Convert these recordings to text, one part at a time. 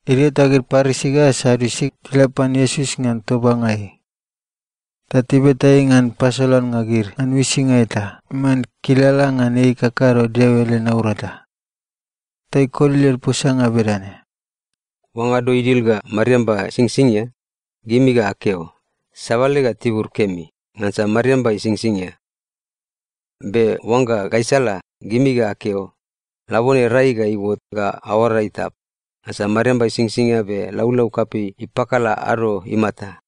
Idio ta gid Parisi ga Sadiusi tila pan Iesus ngan tobanga ei. Ta tibeta ei ngan pasolannga gid ngan uisinga eta iman kilala ngan ei ikakado Deo ele naurata. Ta ikoli led posanga bedane, “Oangga ado idil ga mariamba isingsingia, gimi ga akeo, ‘Sabale ga tibur kemi, ngansa mariamba isingsingia.’ Be oangga gaisala, gimi ga akeo, ‘Labone rai ga iuot ga aoara itap, ngansa mariamba isingsingia be laulau kapei ipakala ado imata.’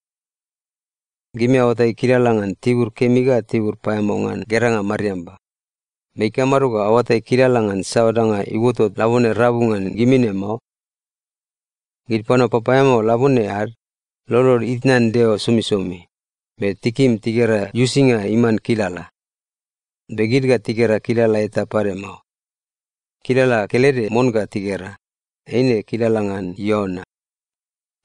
Gimi aoatai kilala ngan tibur kemi ga tibur paeamao ngan geranga mariamba, be ikamado ga aoatai kilala ngan saoa danga iuotot labone rabu ngan gimi ne mao? Gid panua papaeamao labone ad, lolod itnan Deo somisomi, be tikim tigera uisinga iman kilala. Be gid ga tigera kilala eta pade mao. Kilala kelede mon ga tigera, eine kilala ngan Iona.”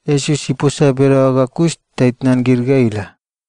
Iesus iposa bedaoa ga kus ta itnan gid ga ila.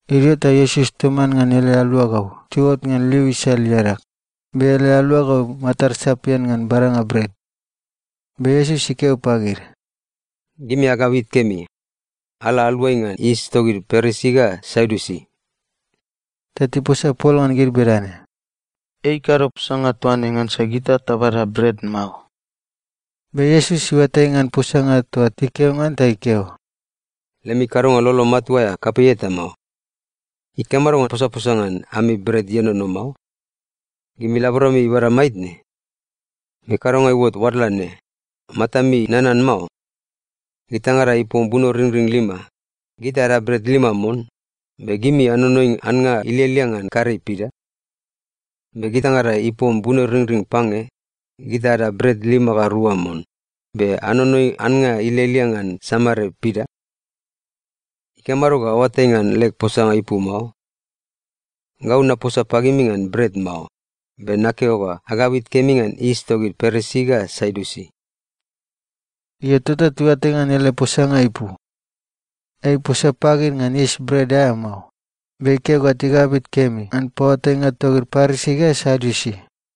Idio ta Iesus toman ngan ele aluagau tiuot ngan liu isal iadag, be ele aluagau matad sapian ngan badanga bret. Be Iesus ikeo pagid, “Gimi agabit kemi. Ala aluai ngan yis togid Parisi ga Sadiusi.” Ta tiposa pol ngan gid bedane, “Ei ikado posanga toa ne ngansa gita tabada bret mao.” Be Iesus iuatai ngan posanga toa tikeo ngan ta ikeo, “Lemi kadonga lolo matua aea kapei eta mao! Ikamado ga aposaposa ngan ami bret ienono mao? Gimi laborami ibada maitne? Be kadonga iuot oadla ne, matami nanan mao? Gitaingada ipom bunoringring lima, gita ada bret lima mon, be gimi anonoi annga ilialia ngan karei pida? Be gitaingada ipom bunoringring pange, gita ada bret lima ga rua mon, be anonoi annga ilialia ngan samare pida? Ikamado ga aoatai ngan leg posanga ipu mao? Gau naposa pagimi ngan bret mao, be nakeo ga agabit kemi ngan yis togid Parisi ga Sadiusi.” Io, tota tiuatai ngan ele posanga ipu. Ei iposa pagid ngan yis bret aea mao, be ikeo ga tigabit kemi ngan paoatainga togid Parisi ga Sadiusi.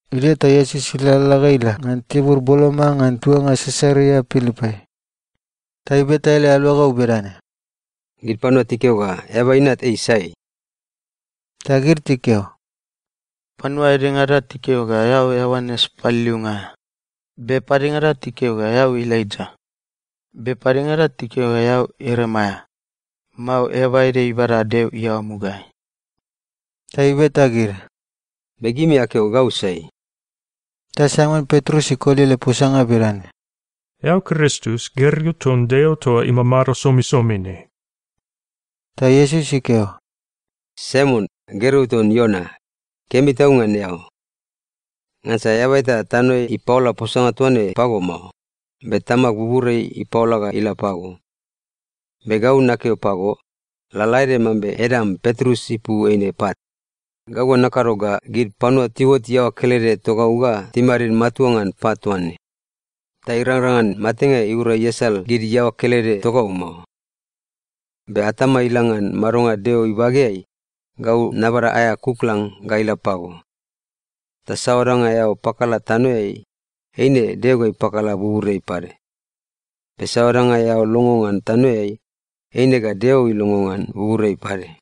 Idio ta Iesus ilalala ga ila ngan tibur boloma ngan tuanga Sisaria Pilipai. Ta ibeta ele aluagau bedane, “Gid panua tikeo ga Eaba Inat ei sai?” Ta gid tikeo, “Panua edengada tikeo ga eao Ioanes Paliliunga aea, be padengada tikeo ga eao Elaija, be padengada tikeo ga eao Ieremaia, mao eaba ede ibada Deo iaoa mugaeai.” Ta ibeta gid, “Be gimi akeo ga gau sai?” Ta Saimon Petrus ikoli ele posanga bedane, “Eao Kristus, gergeu ton Deo toa imamado somisomi ne.” Ta Iesus ikeo, “Saimon, gergeu ton Iona, kemi tau ngan eao! Ngansa eaba eta tanoeai ipaola posanga toa ne pago mao, be Tamag buburiai ipaola ga ila pago. Be gau nakeo pago, lalaede mambe edam Petrus ipu eine ‘pat,’ gau ga nakado ga gid panua tiuot iaoa kelede togau ga timadid matua ngan pat toa ne, ta irangrang ngan matenga iura iasal gid iaoa kelede togau mao. Be atama ila ngan madonga Deo ibageai, gau nabada aea kuklang ga ila pago. Ta saoa danga eao pakala tanoeai, eine Deo ga ipakala buburiai pade, be saoa danga eao longo ngan tanoeai, eine ga Deo ilongo ngan buburiai pade.”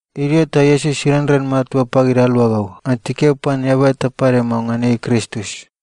Idio ta Iesus irenren matua pagid aluagau ngan tikeo pan eaba eta pade mao ngan ei Kristus.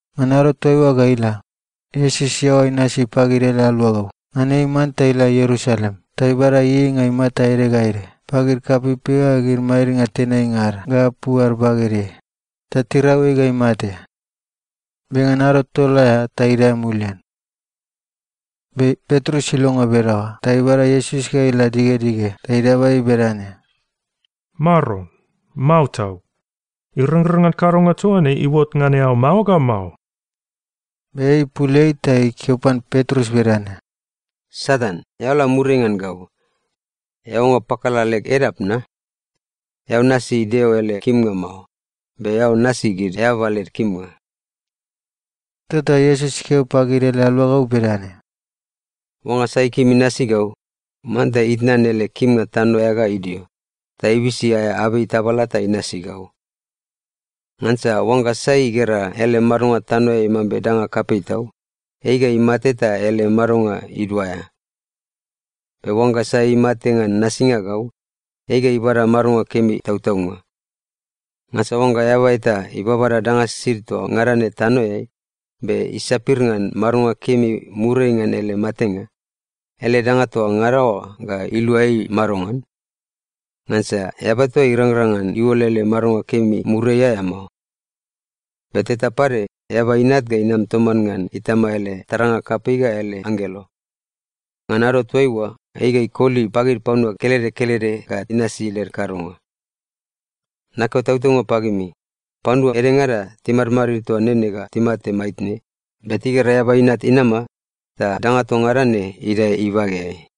Ngan ado toaiua ga ila, Iesus iaoa inasi pagid ele aluagau ngan ei manta ila Ierusalem ta ibada ieieinga imata ede ga ede pagid kapeipei ga gid madidnga tenainga ad ga apu ad bagedeai, ta tirau ei ga imate. Be ngan ado tol aea ta idae mulian. Be Petrus ilongo bedaoa ta ibada Iesus ga ila digedige ta idaba ei bedane, “Maron, mao tau! Irangrang ngan kadonga toa ne iuot ngan eao mao ga mao!” Be ei ipul ei ta ikeo pan Petrus bedane, “Satan, eao la muriai ngan gau! Eao oangga pakala leg edap na? Eao nasi Deo ele kimnga mao, be eao nasi gid eababa led kimnga.” Tota Iesus ikeo pagid ele aluagau bedane, “Oangga sai ikim inasi gau, manta itnan ele kimnga tano aea ga idio, ta ibisi aea abei tabala ta inasi gau. Ngansa oangga sai igera ele madonga tanoeai mambe danga kapei tau, ei ga imate ta ele madonga iduaea. Be oangga sai imate ngan nasinga gau, ei ga ibada madonga kemi tautaunga. Ngansa oangga eaba eta ibabada danga sisid toa ngada ne tanoeai, be isapir ngan madonga kemi muriai ngan ele matenga, ele danga toa ngada oa ga ilua ei madongan? Ngansa eaba eta irangrang ngan iuol ele madonga kemi muriai aea mao. Be teta pade Eaba Inat ga inam toman ngan Itama ele taranga kapei ga ele anggelo. Ngan ado toaiua, ei ga ikoli pagid panua kelede kelede ga inasi led kadonga. Nakeo tautaunga pagimi, panua edengada timadmadid toa nene ga timate maitne, be tigera Eaba Inat inama ta danga toa ngada ne idae ibageai.”